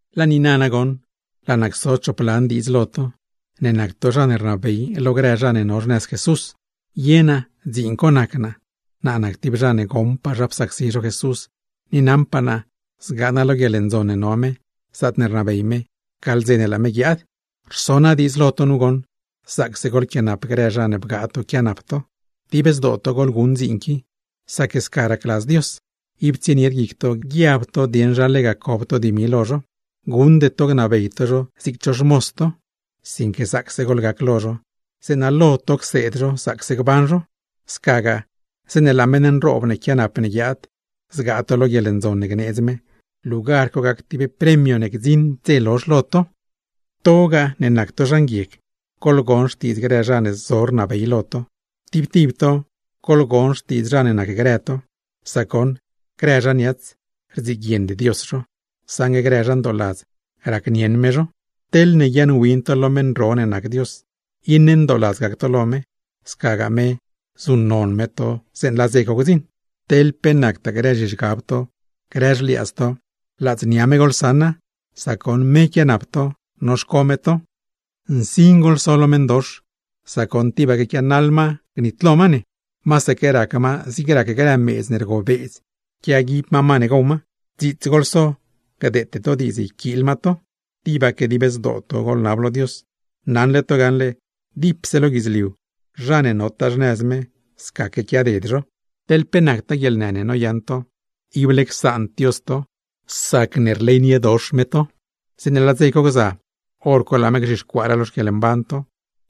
Laa niina nagoṉ, laa naa cso choplan diidz lo to, ne nac to zha ne rnabey lo grë zha ne no xnëz Jesús. Ye naa, dziin co nac naa, naa nac tib zha ne goṉpaa zha psacsi zho Jesús, ni naṉpaa naa zgaa naa lo guieḻndzon ne no me, zaatne rnabey me, gaḻ dze ne laa me guiaad. Rso naa diidz lo to goṉ, zaacse goḻquianap grë zha ne bgaa to noquianap to. Dib zdoo to goḻguṉ dziin qui, sac sca racladz Dios, ib tsienied guic to guiab to dieṉ zha lega cob to dimi lo zho. Guṉde to ne gnabey to zho zig cho xmoz to, sinque zaacse goḻgac lo zho, zeeṉa lo to cseed zho zaacse gban zho. Scagaa, zeeṉe laa meṉ nroob ne quianap ne guiaad, zgaa to lo guieḻndzon ne gneedz me, lugar co gac tib premio ne gdziṉd dze lozh lo to. To ne nac to zha nguieg, goḻgon xtiidz grë zha ne zo rnabey lo to. Tib tib to, goḻgon xtiidz zha ne nacgrë to, sac goṉ: “Grë zha niats, rdziguiend Dios zho, saṉgue grë zha ndooladz, racnieṉ me zho.” Teḻne guiaaṉwin to lo meṉ ro ne nac Dios, iṉe ndooladz gac to lo me, scagaa me zuṉnon me to zeeṉe laa dze co gdziṉ. Teḻ pe nactaa grë zhizhgab to, grë xliaadz to, ladznia me goḻsaṉa, sac goṉ me quianap to, noxco me to. ¡Nsin goḻso lo meṉdox, sac goṉ tibaque quianaḻ ma gnitlo ma ne! Masaque rac ma zig rac grë meedz ne rgobeedz quiaguib ma ne gow. Dziits goḻso gdeete to diidz yquiil ma to. Tibaque dib zdoo to goḻnalo Dios. Naṉle to gaṉle dipse lo guidzliu, zha ne notaa xnëz me, scaque quiaded zho. Teḻ pe nactaa guieḻnë ne noyaṉ to, ible csaand Dios to sacne rleyniedox me to, zeeṉe laa dze co gza, hor co laa me gzhixcuaaraa lo xquieḻmban to,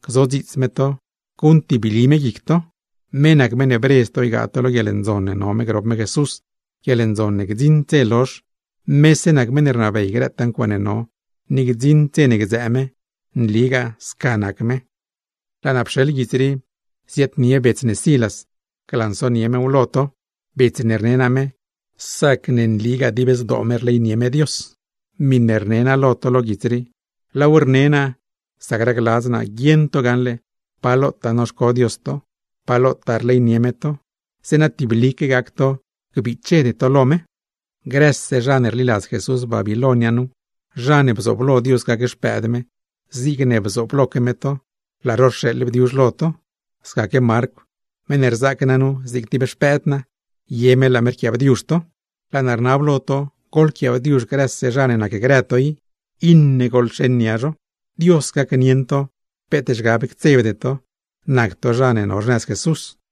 gzodziits me to, guṉtibli me guic to. Me nac meṉ ne bredz ne ygaa ne lo guieḻndzon ne no me grop me Jesús, guieḻndzon ne gdziṉd dze nitlo. Mese nac meṉ ne rnabey grëtaa ncuaaṉe no, ni gdziṉd dze ne gdzëë me. Nligaa sca nac me. Laa naa rxeḻ guits rii lo bets ne Silas, ziaadnie mew lo to, bets ne rne naa me, sac nligaa dib zdoo me rleynie me Dios. Miṉe rne naa lo to lo guits rii, laaw rne naa sac racladz naa guieṉ to gaṉle pa lotaa noxco Dios to, pa lotaa rleynie me to; zeeṉa tiblique gac to gbichede to lo me. Grëse zha ne rliladz Jesús Babiloin nu, zha ne bzooblo Dios gac xpëëd me zigne bzoobloque me to, laa zho rxeeḻ bdiuzh lo to; scaque Marcw, meṉ ne rzaac naa nu zig tib xpëëd naa, ye me laa me rquiaabdiuzh to. Laa naa rnab lo to, goḻquiaabdiuzh grëse zha ne nacgrë to, iṉe goḻxeṉ nia zho. Dios gacnieṉ to peet zhgab ctsebde to, nac to zha ne no xnëz Jesús. Pedr